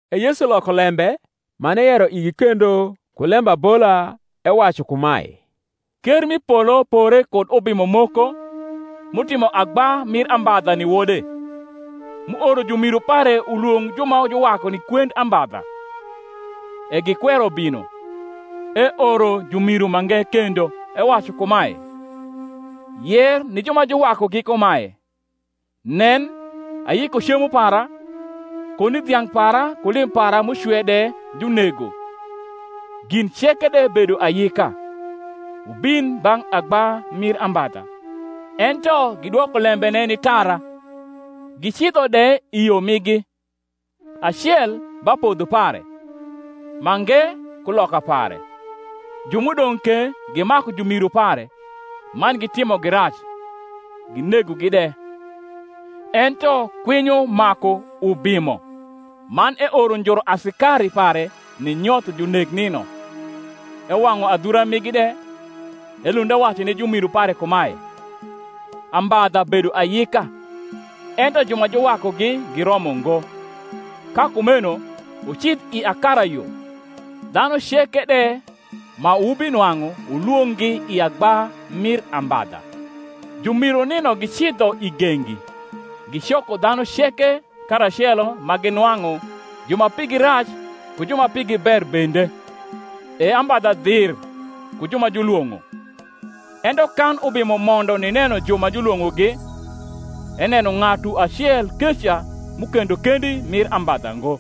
E Yesu loko lembe man eyero igi kendo ku lembabola, ewacu kumae, Ker m’i polo pore kud ubimo moko, m’utimo agba mir ambadha ni wode, m’uoro jumiru pare ulwong’ ju ma juwaku ni kwend ambadha: e gikwero bino. Eoro jurniru mange kendo, ewacu kumae, Yer ni ju ma juwakugi kumae, Nen, ayiko cemo para; koni dhiang’ para ku lim para m’ucwe de junego, gin ceke de bedo ayika: wubin bang’ agba mir ambadha. Ento gidwoko lembene ni tara, gicidho de i yo migi, acel ba podho pare, mange kuloka pare; ju m’udong’ ke gimaku jumiru pare, man gitimogi rac, ginegogi de. Ento kwinyo maku ubimo; man eoro njuru asikari pare, ninyotho junek nino, ewang’u adhura rnigi de. Elund ewacu ni jumiru pare kumae, Ambadha bedo ayika, ento ju ma juwakugi giromo ngo. Ka kumeno wucidh i akarayo, dhanu ceke de ma wubinwang’u wulwong’gi i agba mir ambadha. Jumiru nino gicidho i gengi, gicoko dhanu ceke karacelo ma ginwang’u ju ma pigi rac ku ju ma pigi ber bende: e ambadha dhir ku ju ma julwong’o. Ento kan ubimo mondo nineno ju ma julwong’ogi, eneno ng’atu acel keca m’ukendo kendi mir ambadha ngo: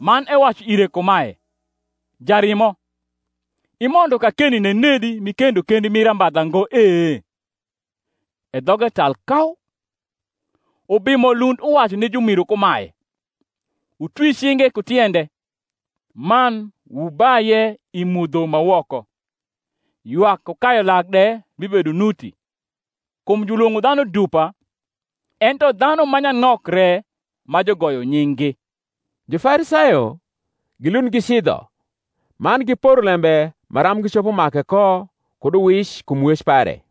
man ewacu ire kumae, Jarimo, imondo kakeni nenedi m’ikendo kendi mir ambadha ngo e? E dhoge tal kau. Ubimo lund uwacu ni jumiru kumae, Wutwi cinge ku tiende, man wubaye i mudho ma woko; ywak ku kayu lak de bibedo nuti. Kum julwong’o dhanu dupa, ento dhanu ma nyanok re ma jugoyo nying’gi. Jufarisayo gilund gicidho, man giporo lembe maram gicopo make ko kud uwic kum wec pare.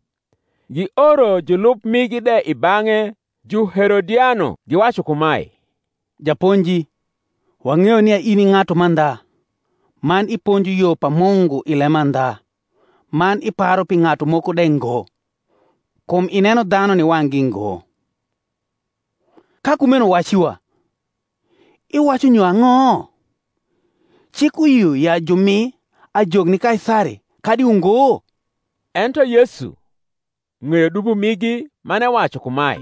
Gioro julub migi de i bang’e, Juherodiano, giwacu kumae, Japonji, wang’eyo nia in i ng’atu mandha, man iponjo yo pa Mungu i lemandha, man iparu pi ng’atu moko de ngo: kum ineno dhanu ni wang’gi ngo. Ka kumeno wac iwa, Iwacu nyo ang’o? Cik uyio ya jumi ajok ni Kaisari, kadi ungo? Ento Yesu ng’eyo dubo migi, man ewacu kumae,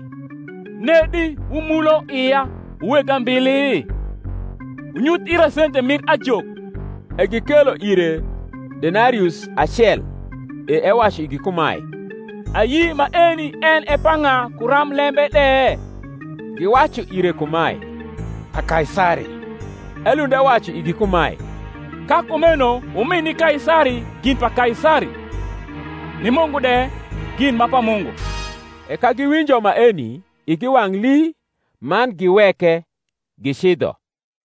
Nedi wumulo ia, wu weg ambili? Wunyuth ira sente mir ajok. E gikelo ire denarius acel. E ewacu igi kumae, Ayi maeni en e pa ng’a ku ramblembe de? Giwacu ire kumae, Pa Kaisari. Elund ewacu igi kumae, Ka kumeno wumi ni Kaisari gin pa Kaisari; ni Mungu de gin ma pa Mungu. E ka giwinjo maeni, igi wang’ lii, man giweke, gicidho.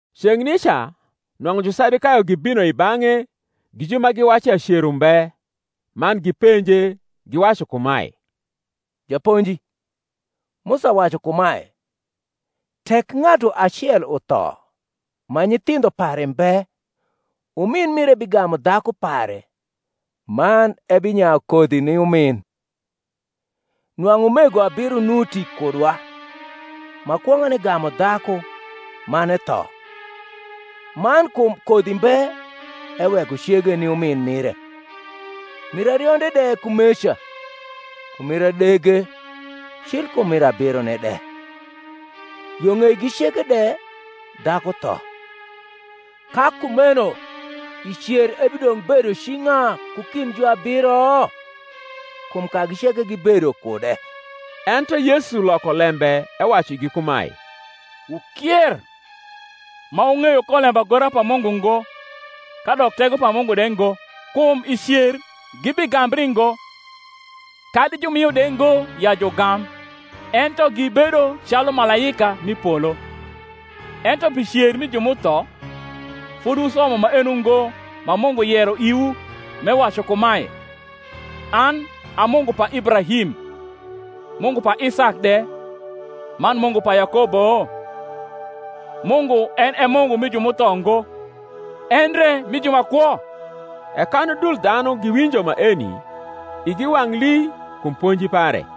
Ceng’ nica nwang’u Jusadukayo gibino i bang’e gi ju ma wacu ya cer umbe: man gipenje, giwacu kumae, Japonji, Musa wacu kumae, Tek ng’atu acel utho, ma nyithindho pare mbe, umin mire bigamu dhaku pare, man ebinyayu kodhi ni umin. Nwang’u umego abiro nuti kudwa: ma kwong’ane gamu dhaku, man etho, man kum kodhi mbe eweko cege ni umin mire; mir arionde de kumeca, ku mir adege, cil kum mir abirone de. Yo ng’eigi ceke de, dhaku tho. Ka kumeno i cer ebidong’ bedo ci ng’a ku kind juabiro? kum kagi ceke gibedo kude. Ento Yesu loko lembe ewacu igi kumae, Wukier, ma wung’eyo ko lembagora pa Mungu ngo, kadok tego pa Mungu de ngo. Kum i cer gibigambri ngo, kadi jurnio de ngo ya jugam, ento gibedo calu malaika m’i polo. Ento pi cer mi ju m’utho, fodi wusomo maeno ngo ma Mungu yero iwu, m’ewacu kumae, An a Mungu pa Ibrahim, Mungu pa Isak de, man Mungu pa Yakobo? Mungu en e Mungu mi ju m’utho ngo, endre mi ju ma kwo. E kan udul dhanu giwinjo maeni, igi wang’ lii kum ponji pare.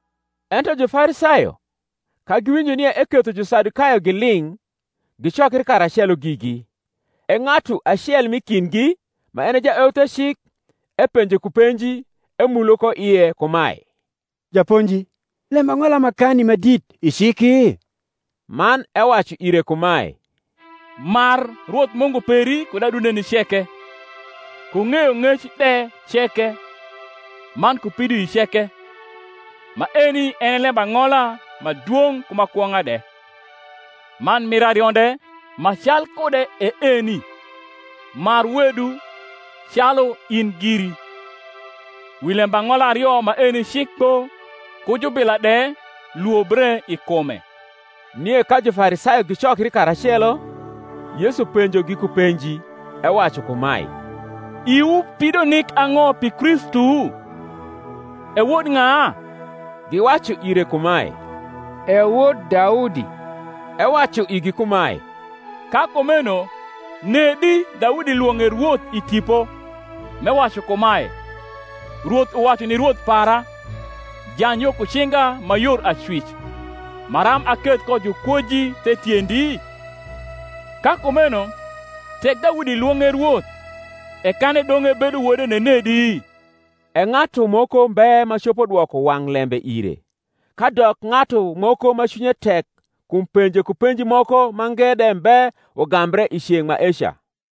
Ento Jufarisayo, ka giwinjo nia eketho Jusadukayo giling’, gicokri karacelo gigi. E ng’atu acel m’i kindgi, ma en e jaeuthecik, epenje ku penji, emulo ko ie kumae: Japonji, lembang’ola makani ma dit i ciki? Man ewacu ire kumae, Mar Rwoth Mungu peri kud adundeni ceke, ku ng’eyong’ec de ceke, man ku pidoii ceke. Maeni en e lembang’ola ma dwong’ ku ma kwong’a de. Man mir arionde ma calkude e eni, Mar wedu calu in giri. Wi lembang’ola ario maeni cik kpo, ku jubila de lwobre i kume. Nie ka Jufarisayo gicokri karacelo, Yesu penjogi ku penji, ewacu kumae, Iwu pido nik ang’o pi Kristu? e wod ng’a? Giwacu ire kumae, E wod Daudi. Ewacu igi kumae, Ka kumeno nedi Daudi lwong’e Rwoth i Tipo, m’ewacu kumae, Rwoth uwacu ni Rwoth para, Jany yo ku cinga ma yor acwic, Maram aketh ko jukwoji the tiendi? Ka kumeno tek Daudi lwong’e Rwoth, e kan edong’ ebedo wode nenedi? E ng’atu moko mbe ma copo dwoko wang’ lembe ire, kadok ng’atu moko ma cwinye tek kum penje ku penji moko mange de mbe ugambre i ceng’ maeca.